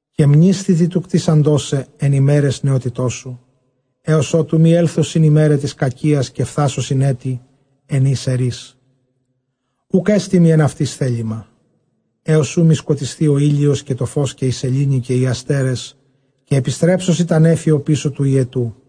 Καὶ μνήσθητι τοῦ κτίσαντός σε ἐν ἡμέραις νεότητός σου, ἕως ὅτου μὴ ἔλθωσιν αἱ ἡμέραι τῆς κακίας, καὶ φθάσουσιν ἔτη ἐν οἷς ἐρεῖς, οὐκ ἔστι μοι ἐν αὐτοῖς θέλημα. Ἕως οὗ μὴ σκοτισθῇ ὁ ἥλιος καὶ τὸ φῶς, καὶ ἡ σελήνη καὶ οἱ ἀστέρες, καὶ ἐπιστρέψουσι τὰ νέφη ὀπίσω τοῦ ὑετοῦ.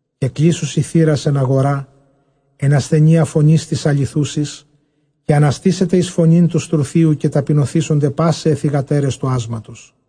Καὶ κλείσουσι θύρας ἐν ἀγορᾷ, ἐν ἀσθενείᾳ φωνῆς τῆς ἀληθούσης· καὶ ἀναστήσεται εἰς φωνὴν τοῦ στρουθίου, καὶ ταπεινωθήσονται πᾶσαι αἱ θυγατέρες τοῦ ᾄσματος·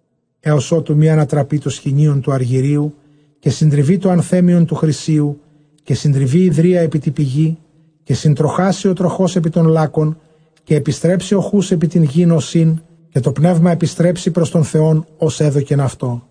Ἕως ὅτου μὴ ἀνατραπῇ τὸ σχοινίον τοῦ ἀργυρίου, καὶ συντριβῇ τὸ ἀνθέμιον τοῦ χρυσίου, καὶ συντριβῇ ὑδρία ἐπὶ τῇ πηγῇ, καὶ συντροχάσῃ ὁ τροχὸς ἐπὶ τὸν λάκκον· Καὶ ἐπιστρέψῃ ὁ χοῦς ἐπὶ τὴν γῆν ὡς ἦν, καὶ τὸ πνεῦμα ἐπιστρέψῃ πρὸς τὸν Θεὸν ὃς ἔδωκεν αὐτό.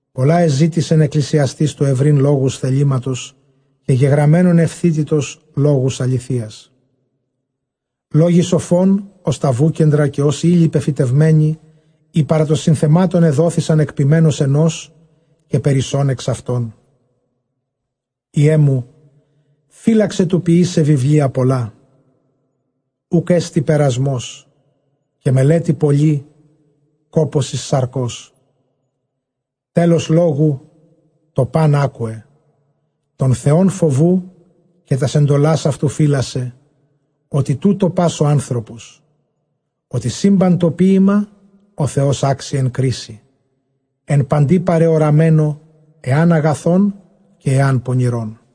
Πολλὰ ἐζήτησεν Ἐκκλησιαστὴς τοῦ εὑρεῖν λόγους θελήματος, καὶ γεγραμμένον εὐθύτητος, λόγους ἀληθείας. Λόγοι σοφῶν ὡς τὰ βούκεντρα, καὶ ὡς ἧλοι πεφυτευμένοι, οἳ παρὰ τῶν συνθεμάτων ἐδόθησαν ἐκ ποιμένος ἑνός. Καὶ περισσὸν ἐξ αὐτῶν υἱέ μου φύλαξαι· τοῦ ποιῆσαι βιβλία πολλὰ οὐκ ἔστι περασμὸς, καὶ μελέτη πολλὴ κόπωσις σαρκός. Τέλος λόγου, τὸ πᾶν ἄκουε· τὸν Θεὸν φοβοῦ, καὶ τὰς ἐντολὰς αὐτοῦ φύλασσε· ὅτι τοῦτο πᾶς ὁ ἄνθρωπος. Ὅτι σύμπαν τὸ ποίημα ὁ Θεὸς ἄξει ἐν κρίσει, ἐν παντὶ παρεωραμένῳ, ἐὰν ἀγαθὸν καὶ ἐὰν πονηρόν.